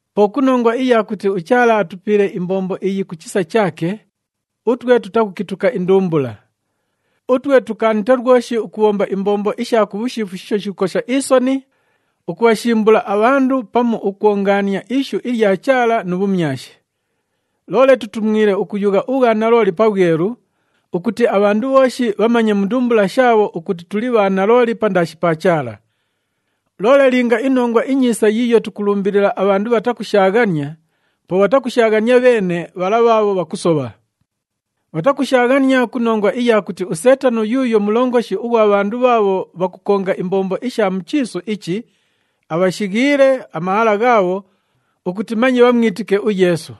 Po ku nongwa iya kuti uChaala atupiile imbombo iyi ku chisa chaake, utwe tutakukituka indumbula. Utwe tukaanite lwoshi ukubhomba imbombo isha ku bhushiifu shiisho shikukosha isoni, ukubhashimbula abhandu pamu ukwongaania ishu ilya Chaala nu bhumyashi. Loole tutumwile ukuyugha ubhwanalooli pabhwelu ukuti abhandu bhooshi bhamanye mu ndumbula shaabho ukuti tuli bha nalooli pandaashi pa Chaala. Loole linga iNongwa iNyiisa yiiyo tukulumbilila abhandu bhatakushaaghania, po bhatakushaaghania bheene bhala bhaabho bhakusobha. Bhatakushaaghania ku nongwa iya kuti uSeetano yuuyo mulongoshi ughwa bhandu bhaabho bhakukonga imbombo isha mu chiisu ichi, abhashighiile amahala ghaabho ukuti manye bhamwitike uYeesu.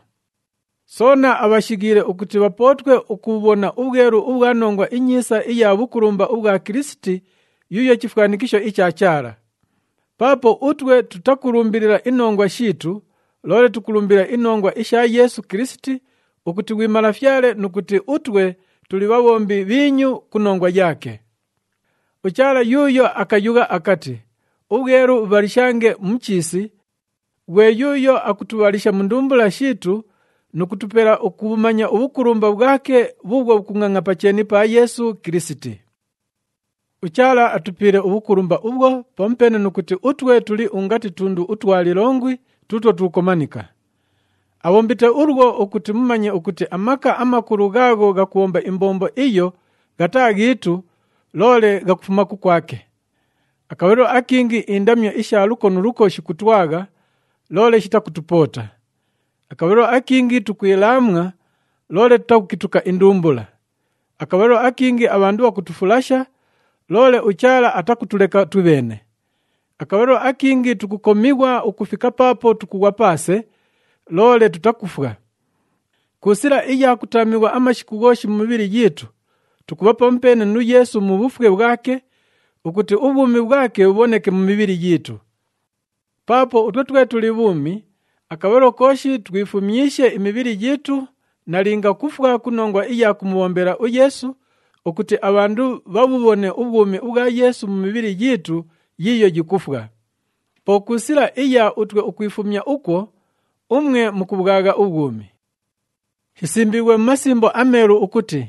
Soona abhashighiile ukuti bhapootwe ukubhubhona ubhwelu ubhwa Nongwa iNyiisa iya bhukulumba ubhwa Kilisiti yuuyo chifwanikisho icha Chaala. Paapo utwe tutakulumbilila inongwa shiitu, loole tukulumbilila inongwa isha Yeesu Kilisiti ukuti ghwi Malafyale nu kuti utwe tuli bhabhombi bhiinyu ku nongwa yaake. UChaala yuuyo akayugha akati, “Ubhwelu bhubhalishange mu chiisi,” ghwe yuuyo akutubhalisha mu ndumbula shiitu nu kutupela ukubhumanya ubhukulumba bhwake bhuubhwo bhukungʼangʼa pa cheeni pa Yeesu Kilisiti. UChaala atupiile ubhukulumba ubhwo, pamupeene nu kuti utwe tuli ungati tundu utwa lilongwi tuutwo tukukomanika. Abhombite ulwo ukuti mumanye ukuti amaka amakulu ghaagho ghakubhomba imbombo iyo ghataa ghiitu, loole ghakufuma kukwake. Akabhalilo akingi indamyo isha luko nu luko shikutwagha, loole shitakutupoota. Akabhalilo akingi tukwilaamwa, loole tutakukituka indumbula. Akabhalilo akingi abhandu bhakutufulasha, loole uChaala atakutuleka twibheene. Akabhalilo akingi tukukomighwa ukufika paapo tukughwa paase, loole tutakufwa. Ku sila iya kutaamighwa amashiku ghooshi mu mibhili yiitu, tukubha pamupeene nu Yeesu mu bhufwe bhwake, ukuti ubhwumi bhwake bhubhoneke mu mibhili yiitu. Paapo utwe twe tuli bhuumi, akabhalilo kooshi twifumyishe imibhili yiitu nalinga kufwa ku nongwa iya kumubhombela uYeesu, ukuti abhandu bhabhubhone ubhwumi ubhwa Yeesu mu mibhili yiitu yiiyo yikufwa. Po ku sila iya utwe ukwifumya ukwo, umwe mukubhwagha ubhwumi. Shisimbiighwe mu Masimbo aMeelu ukuti,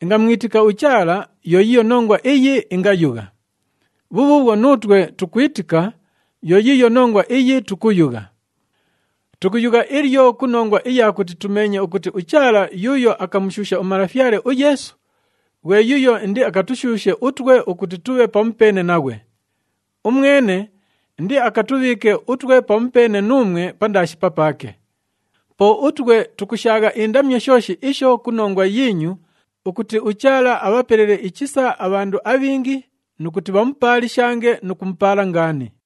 “Ingamwitika uChaala, yo yiiyo nongwa iyi ingayugha.” Bhubhuubhwo nuutwe tukwitika, yo yiiyo nongwa iyi tukuyugha. Tukuyugha ilyo ku nongwa iya kuti tumeenye ukuti uChaala yuuyo akamushuusha uMalafyale uYeesu, ghwe yuuyo indiakatushuushe utwe ukuti tubhe pamupeene naghwe. Umwene indiakatubhiike utwe pamupeene nuumwe pandaashi papaake. Po utwe tukushaagha indamyo shooshi isho ku nongwa yiinyu, ukuti uChaala abhapelele ichisa abhandu abhingi nu kuti bhamupaalishange nu kumupaala ngaani.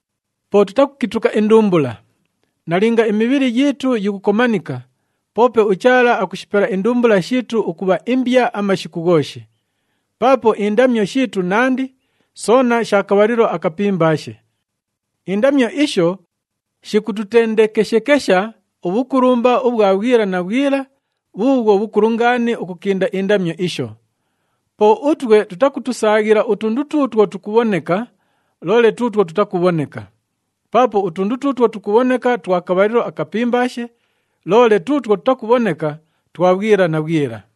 Po tutakukituka indumbula. Nalinga imibhili yiitu yikukomanika, poope uChaala akushipela indumbula shiitu ukubha imbya amashiku ghooshi. Paapo indamyo shiitu nandi, soona sha kabhalilo akapimbaashe. Indamyo isho, shikututendekeshekesha ubhukulumba ubhwa bhwila na bhwila bhuubhwo bhukulu ngaani ukukinda indamyo isho. Po utwe tutakutusaaghila utundu tuutwo tukubhoneka, loole tuutwo tutakubhoneka. Paapo utundu tuutwo tukubhoneka twa kabhalilo akapimbaashe, loole tuutwo tutakubhoneka twa bhwila na bhwila.